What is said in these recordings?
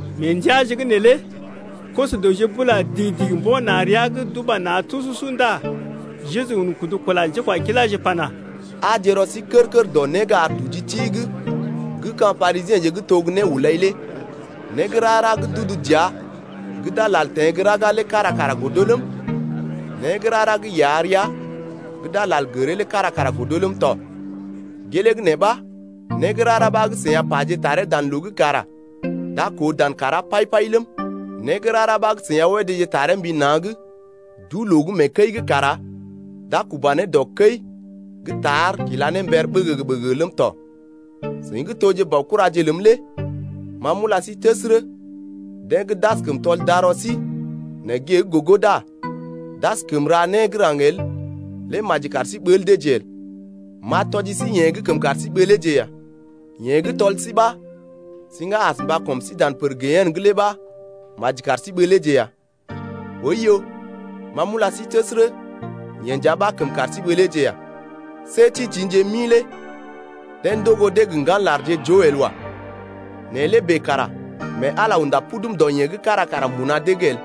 Mee ndəaje’g neelé koso-dəwje bula digi-digi mbo̰ na̰ rəa’g d’uba na̰ tususu ndá Jeju un kudu kula njékwakiláje pana: Aaje rɔ sí kər-kər dɔ né gə́ ar nduji ti’g gə́ ka̰ Parisiḛje gə́ to gə́ néhulai lé. Né gə́ rara gə́ d’udu dəa gə́ d’a lal teḛ gə́ raga lé kára kara godo ləm, né gə́ rara gə́ iya rəa gə́ d’a lal gəree lé kára kara godo ləm tɔ. Gelee gə́ nee ɓa né gə́ rara ɓa gə́ seḭ a paje taree dan loo’g kara d’a koo dan kàrá pai-pai ləm, né gə́ rara ɓa gə́ seḭ a wédéje taree mbi na̰’g duu-loo’g mee kəi’g kara d’a kuba ne dɔ kəi gə́ tar kila ne mber ɓəgəgə-ɓəgəgə ləm tɔ. Seḭ gə́ toje baokuraje ləm lé ma m’ula sí təsərə: Deḛ gə́ d’askəm tɔl darɔ sí nɛ gée’g gogo ndá d’askəm ra né gə́ raŋg el lé maji kar sí ɓəl deeje el. M’a tɔji sí yeḛ gə́ kəm kar sí ɓəleeje ya. Yeḛ gə́ tɔl sí ɓa siŋga as mba kɔm sí dan pər gehene’g lé ɓəi maji kar sí ɓəleeje ya. Oiyo, ma m’ula sí təsərə, yeḛ nja ɓa kəm kar sí ɓəleeje ya. See tḭtḭje mi lé deḛ ndogo dee gə ŋgan larje joo el wa. Nɛ lé bèe kara mee Ala lé unda pudum dɔ yee gə́ kára kara mbuna dee’g el.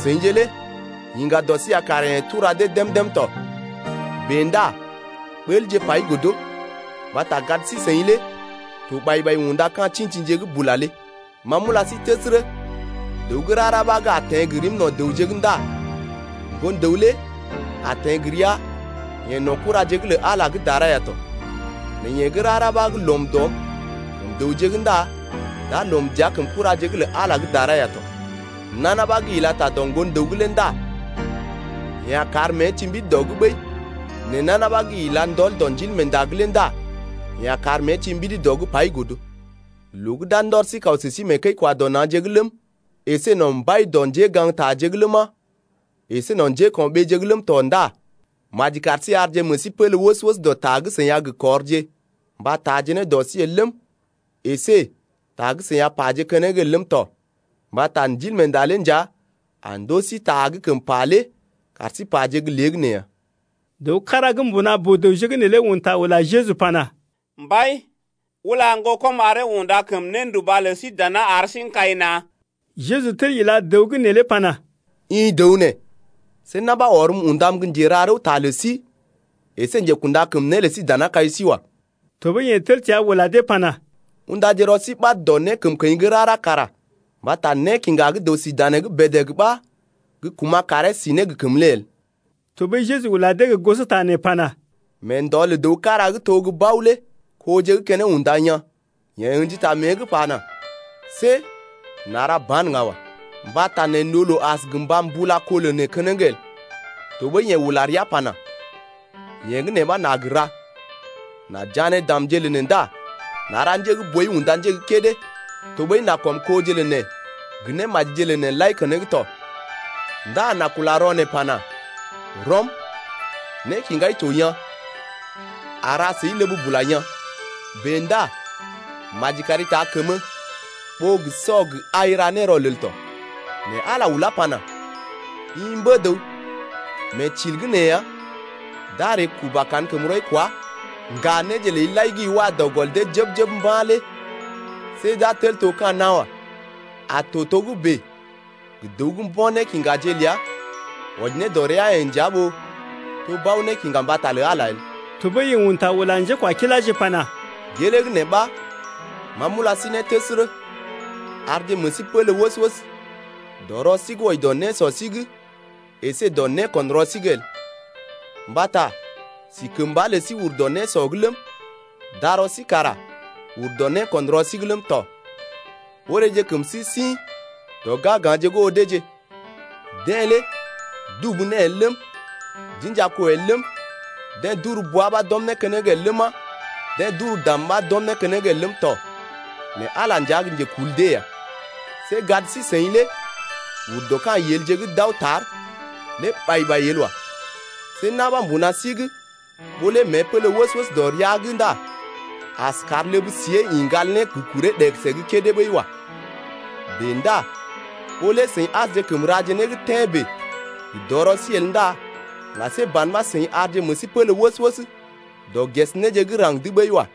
Seḭje lé yiŋga dɔ sí ya kara yeḛ tura dee dém-dém tɔ. Bèe ndá ɓəlje pai godo, mbata gad sí-seḭ lé to ɓai-ɓai unda ka̰ tḭtḭje gə́ bula lé. Ma m’ula sí təsərə, dəw gə́ rara ɓa gə́ a teḛ gə rim no̰ dəwje’g ndá Ŋgon-dəw lé a teḛ gə ria-yeḛ no̰ kuraje’g lə Ala gə́ dara ya tɔ. Nɛ yeḛ gə́ rara ɓa gə́ lɔm dɔm kəm dəwje’g ndá d’a lɔm dəa kəm kuraje’g lə Ala gə́ dara ya tɔ. Nana ɓa gə́ ila ta dɔ Ŋgon-dəw’g lé ndá yeḛ a kar mée ti mbidi dɔ’g ɓəi, nɛ nana ɓa gə́ ila ndɔl dɔ Ndilmeenda’g lé ndá yeḛ a kar mée ti mbidi dɔ’g pai godo. Loo gə́ d’a ndɔr sí kaw sə sí mee kəi-kwa-dɔ-na̰je’g ləm, əsé no̰ mbai dɔ njégaŋgtaje’g ləma, əsé no̰ njéko̰ɓeeje’g ləm tɔ ndá maji kar sí arje meḛ sí pélé wəs-wəs dɔ ta gə́ seḭ a gə kɔrje mba taaje ne dɔ sí el ləm, əsé ta gə́ seḭ a paje keneŋ el ləm tɔ 2mbata Ndilmeenda lé nja a ndoo sí ta gə́ kəm pa lé kar sí paje gə́ léegəneeya. Dəw kára gə́ mbuna boo-dəwje’g neelé un ta ula Jeju pana: Mbai, ula ŋgokɔm aree unda kəm nénduba lə sí dana ar sí n’kai na̰. Jeju tel ila dəw gə́ neelé pana: I dəw nee, see na̰ ɓa ɔrm undam gə́ njera rəwta lə sí əsé njekunda kəm né lə sí dana kai sí wa. Tɔɓəi yeḛ tel təa ula dee pana: Undaje rɔ sí ɓad dɔ nékəmkəḭ gə́ rara kara, mbata nékiŋga gə́ dəw sí danee’g bèdèg ɓa gə́ kuma̰ karee si ne gə kəmə lé el. Tɔɓəi Jeju ula dee gə́ gosota nee pana: Mee ndɔ lə dəw kára gə́ to gə́ bao lé koje gə́ keneŋ unda yaa̰. Yeḛ ə̰ji ta mée’g pana: See n’a ra ba̰ ŋga wa. Mbata neḛ n’oo loo as gə mba mbula kó lə neḛ keneŋ el. Tɔɓəi yeḛ ula rəa pana: Yee gə́ nee ɓa n’a gə ra, n’a jané damje lə neḛ ndá n’a gə njé gə́ boi unda njé gə́ kédé, tɔɓəi n’a kɔm koje lə neḛ gə némajije lə neḛ lai keneŋ tɔ, ndá n’a kula rɔ neḛ pana: Rɔm, nékiŋgai to yaa̰, a ra səi ləb bula yaa̰. Bèe ndá maji kari taa kəmə ɓó gə sɔ gə ai ra ne rɔlel tɔ. Nɛ Ala ulá pana: I mbə-dəw, mee til’g nee ya d’a ree kuba kankəmrɔi kwa, ŋga néje ləi lai gə́ i wa dɔ gɔl dee jəb-jəb mba̰ lé see d’a tel to ka̰ nawa. A to togə́bè gə dəw gə́ mbo̰ nékiŋgaje ləa wɔji ne dɔ rəa-yeḛ nja ɓó to bao-nékiŋga mbata lə Ala el. Tɔɓəi yeḛ un ta ula njékwakiláje pana: Gelee gə́ nee ɓa ma m’ula sí ne təsərə: Arje meḛ sí pélé wəs-wəs dɔ rɔ sí’g el wɔji ne dɔ nésɔ sí’g əsé dɔ né ko̰ rɔ sí’g el. Mbata si kəmba lə sí ur dɔ nékusɔ’g ləm, darɔ sí kara uru dɔ néko̰ rɔ sí’g ləm tɔ. Oreeje kəm sí sḭ dɔ ga̰-ga̰je’g oo deeje. Dee lé dubu né el ləm, d’inja kó el ləm, dee d’uru bwa ɓa d’ɔm né keneŋ el ləma, dee d’ur dam ɓa d’ɔm né keneŋ el ləm tɔ, nɛ Ala nja gə́ njekul dee ya. See gad sí-seḭ lé ur dɔ ka̰ yelje gə́ d’aw tar lé ɓai-ɓai el wa. See na̰ ɓa mbuna sí’g ɓó lé mée pélé wəs-wəs dɔ rəa’g ndá askəm kar ləb-siée ḭ ŋgal ne gə kuree ɗegəse gə́ kédé ɓəi wa. Bèe ndá ɓó lé seḭ asjekəm raje né gə́ tḛ́ bèe gə dɔrɔ sí el ndá ŋga see ban ɓa seḭ arje meḛ sí pélé wəs-wəs dɔ ges néje gə́ raŋg’d ɓəi wa.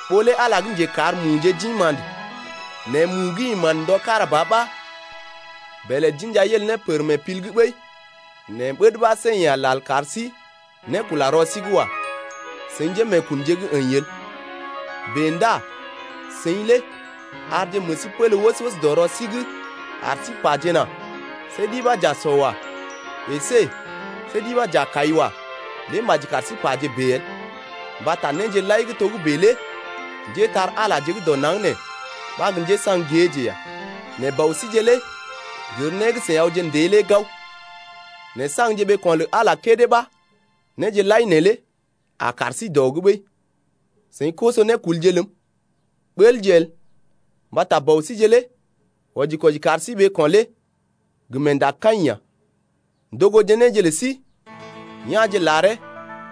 Ɓó lé Ala lé gə́ njekar muje d’ḭ ma̰də nɛ mu gə́ ḭ ma̰də ndɔ kára ba ɓa bèlè d’inja yel ne pər mee pil’g ɓəi nɛ ɓəd ɓa see yeḛ a lal kar sí nékula rɔ sí’g wa, seḭ njémeekunje gə́ əḭ el. Bèe ndá seḭ lé arje meḛ sí pélé wəs-wəs dɔ rɔ sí’g ar sí pajena: See ɗi ɓa j’a sɔ wa, əsé see ɗi ɓa j’a kai wa lé maji kar sí paje bèe el. Mbata néje lai gə́ togə́bè lé njépole-magəje gə́ dɔ naŋg nee ɓa gə́ njésaŋ géeje ya. Nɛ Bɔ síje lé gər né gə́ seḭ awje ndée lé gao. Nɛ saŋgje ɓeeko̰ lə Ala kédé ɓa néje lai neelé a kar sí dɔ’g ɓəi. Seḭ koso-nékulje ləm, ɓəlje el, mbata Bɔ síje lé wɔji-kwɔji kar sí ɓeeko̰ lé gə meendakaḭ ya. Ndogoje néje lə sí ya̰je laree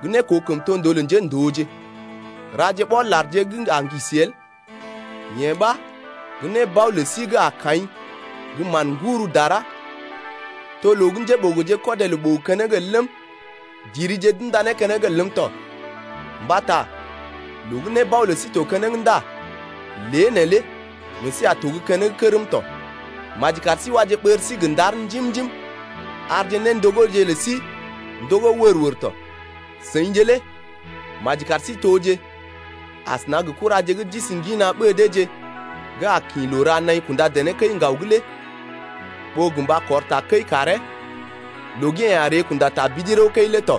gə́ nékoo kəmtondoo lə njéndooje. Raje ɓɔl-larje gə́ a ŋgisi el, yee ɓa gə́ nébao lə sí gə́ a kaḭ gə́ mán-ŋgur dara to loo gə́ njéɓogoje kɔdee loo ɓogo keneŋ el ləm, dirije d’unda né keneŋ el ləm tɔ. Mbata loo gə́ nébao lə sí to keneŋ ndá lé neelé meḛ sí a to gə́ keneŋ kərm tɔ. Maji kar sí waje ɓər sí gə ndar njim-njim, arje néndogoje lə sí ndogó wər-wər tɔ. Seḭje lé maji kar toje asəna gə kuraje gə́ d’isi ŋgina ɓée deeje gə́ a kḭ loo ra naḭ kunda dené kəi-ŋgaw’g lé ɓó gə mba kɔr takəi karee loo gə́ yeḛ a ree kunda tabidi rəw-kəi lé tɔ.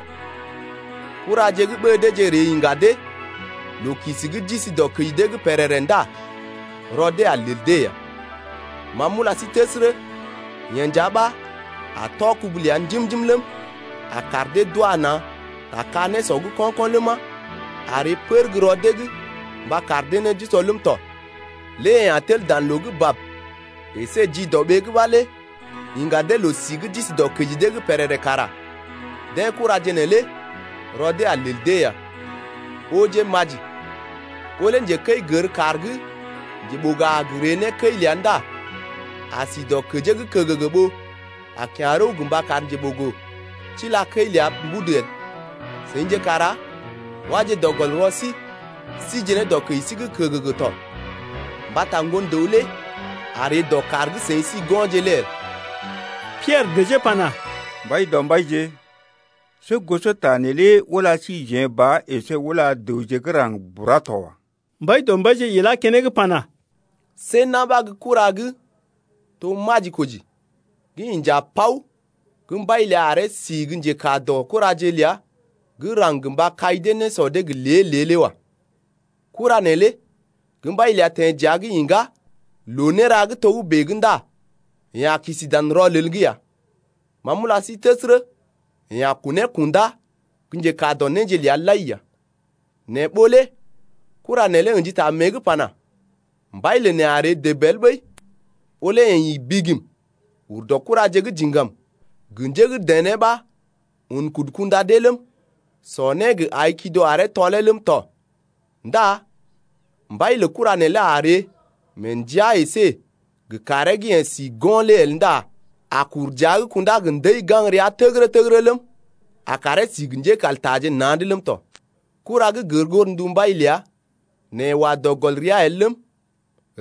Kuraje gə́ ɓée deeje ree iŋga dee loo-kisi gə́ d’isi dɔkəji dee’g pèrèrè ndá rɔ dee a lel dee ya. Ma m’ula sí təsərə, yeḛ nja ɓa a tɔ kubu ləa njim-njim ləm, a kar dee d’wa na̰ ta ka-nésɔ’g ko̰-ko̰ ləma, a ree pər gə́ rɔ dee’g mba kar dee né d’usɔ ləm tɔ. Lé yeḛ a tel dan loo bab əsé jidɔɓee’g ɓa lé iŋga dee loo-si gə́ d’isi dɔkəji dee’g pèrèrè kara deḛ kuraje neelé rɔ dee a lel dee ya. Ooje maji, ɓó lé njekəi gər kàr gə́ njeɓogo a gə ree ne kəi ləa ndá a si dɔkəjee’g kəgəgə ɓó a kya̰ rəw gə mba kar njeɓogo tila kəi ləa mbudu el. Seḭje kara waje dɔ gɔl rɔ sí síje ne dɔkəji sí’g kəgəgə tɔ, mbata Ŋgon-dəw lé a ree dɔ kàr gə́ seḭ si go̰je lé el. Piɛrə dəjee pana: Mbaidɔmbaije, see gosota neelé ula síjeḛ ba əsé ula dəwje gə́ raŋg bura to wa. Mbaidɔmbaije ilá keneŋ pana: See na̰ ɓa gə́ kura gə́ to majikoji gə́ inja paw gə́ mbai ləa aree si gə́ njekaa dɔ kuraje’g ləa gə́ raŋg gə mba kai dee nésɔ dee gə lée-lée lé wa. Kura neelé gə́ mbai ləa teḛ dəa’g iŋgá loo néra gə́ togə́bè’g ndá yeḛ a kisi dan rɔlel’g ya. Ma m’ula sí təsərə, yeḛ a kunee kundá gə́ njekaa dɔ néje ləa lai ya. Nɛ ɓó lé kura neelé ə̰ji ta mée’g pana, Mbai lə neḛ a ree dəb el ɓəi, ɓó lé yeḛ ḭ bigim ur dɔ kuraje gə́ diŋgam gə njé gə́ dené ɓa un kudu kunda dee ləm, sɔ né gə́ ai kido aree tɔlee ləm tɔ ndá mbai lə kura neelé a ree mee ndəa əsé gə kàree gə́ yeḛ si go̰ lé el ndá a kur dəa’g kundá gə ndəi gaŋg rəa təgərə-təgərə ləm, a karee si gə njékaltaje na̰’d ləm tɔ. Kura gə́ gər godndu mbai ləa nɛ yeḛ wa dɔ gɔl rəa el ləm,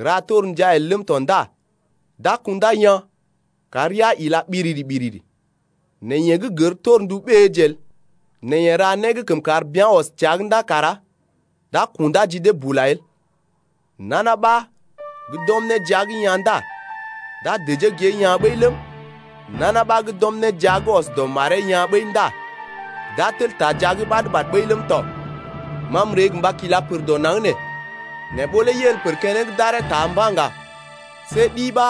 ra torndia el ləm tɔ ndá d’a kundá yaa̰ kar rəa ila ɓiriri-ɓiriri. Nɛ yeḛ gə́ gər torndu ɓéeje el, nɛ yeḛ ra né gə́ kəm kar bea̰ ɔs təa’g ndá kara d’a kundá ji dee bula el. Nana ɓa gə́ d’ɔm né jia’g yaa̰ ndá d’a dəjee gée yaa̰ ɓəi ləm, nana ɓa gə́ d’ɔm né jia’g ɔs dɔ maree yaa̰ ɓəi ndá d’a tel taa jia’g ɓad-ɓad ɓəi ləm tɔ. Ma m’ree gə mba kila pər dɔ naŋg nee, nɛ ɓó lé yel pər keneŋ d’aree taa mba̰ ŋga see ɗi ɓa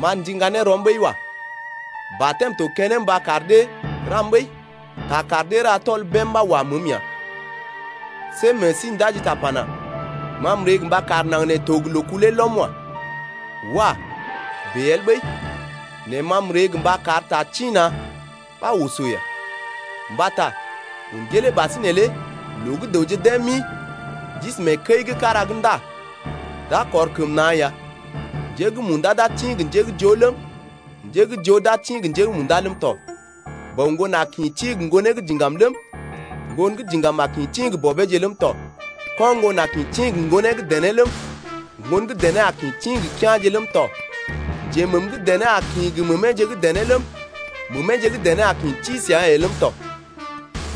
m’a ndiŋga ne rɔm ɓəi wa. Batɛm to keneŋ mba kar dee ram ɓəi, ta kar dee ra tɔl bém ɓa wa məəm ya. See meḛ sí ndaji ta pana: Ma m’ree gə mba kar naŋg nee to gə loo-kulee lɔm wa. Wah! bèe el ɓəi, nɛ ma m’ree gə mba kar ta tḭ-na̰ ɓa oso ya. Mbata un gelee ɓasinè lé loo gə́ dəwje dee mi d’isi mee kəi gə́ kára’g ndá d’a kɔr kəm na̰ ya, njé gə́ munda d’a tḭ gə njé gə́ joo ləm, njé gə́ joo d’a tḭ gə njé gə́ munda ləm tɔ. Bɔ ŋgon a kḭ tḭ gə ŋgonee gə́ diŋgam ləm, ŋgon gə́ diŋgam a kḭ tḭ gə bɔbeeje ləm tɔ, ko̰ ŋgon a kḭ tḭ gə ŋgonee gə́ dené ləm, ŋgon gə́ dené a kḭ tḭ gə kea̰je ləm tɔ, njeməm gə́ dené a kḭ tḭ gə məmeeje gə́ dené ləm, məmeeje gə́ dené a kḭ tḭ səa-yeḛ ləm tɔ.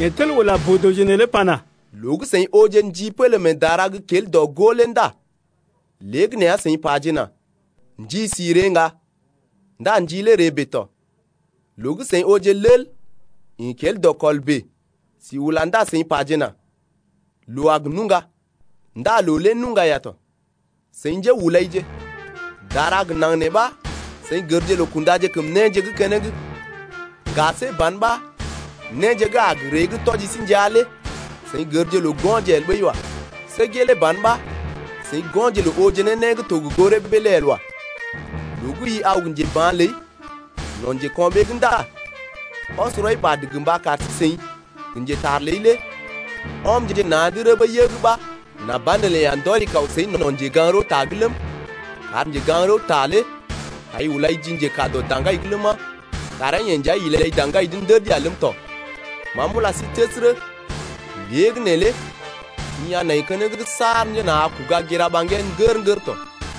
Yeḛ tel ula boo-dəwje neelé pana: Loo gə́ seḭ ooje ndi pélé mee dara’g gə́ kel dɔ-gó lé ndá léegəneeya seḭ pajena: Ndi si ree ŋga. Ndá ndi lé ree ya tɔ. Loo gə́ seḭ ooje lel ḭ gə́ kel dɔkɔl bèe sí ula ndá seḭ pajena: Loo a gə nuŋga. Ndá loo lé nuŋga ya tɔ. Seḭ njéhulaije! Dara gə naŋg nee ɓa seḭ gərje loo kundaje kəm néje gə́ keneŋ, ŋga see ban ɓa néje gə́ a gə ree gə́ tɔji sí ndəa lé seḭ gərje loo go̰je el ɓəi wa. See gelee ban ɓa seḭ go̰je loo ooje ne né gə́ to gə goo rəbee lé el wa. Loo gə́ i aw gə njeba̰ ləi no̰ njeko̰ɓee’g ndá ɔs rɔi ɓad gə mba kar sí-seḭ gə njetar ləi lé ɔmje na̰’d rəbə yəg ɓa nà banelə yeḛ a ndɔri kaw səi no̰ njegaŋ-rəwta’g ləm, kar njegaŋ-rəwta lé taai ulai ji njekaa dɔ daŋgai’g ləma, karee-yeḛ nja ilai daŋgai’g ndəd ya ləm tɔ. Ma m’ulai təsərə, lée gə́ neelé i a nai keneŋ saar njena a kuga gira ɓaŋgee ŋgər-ŋgər tɔ.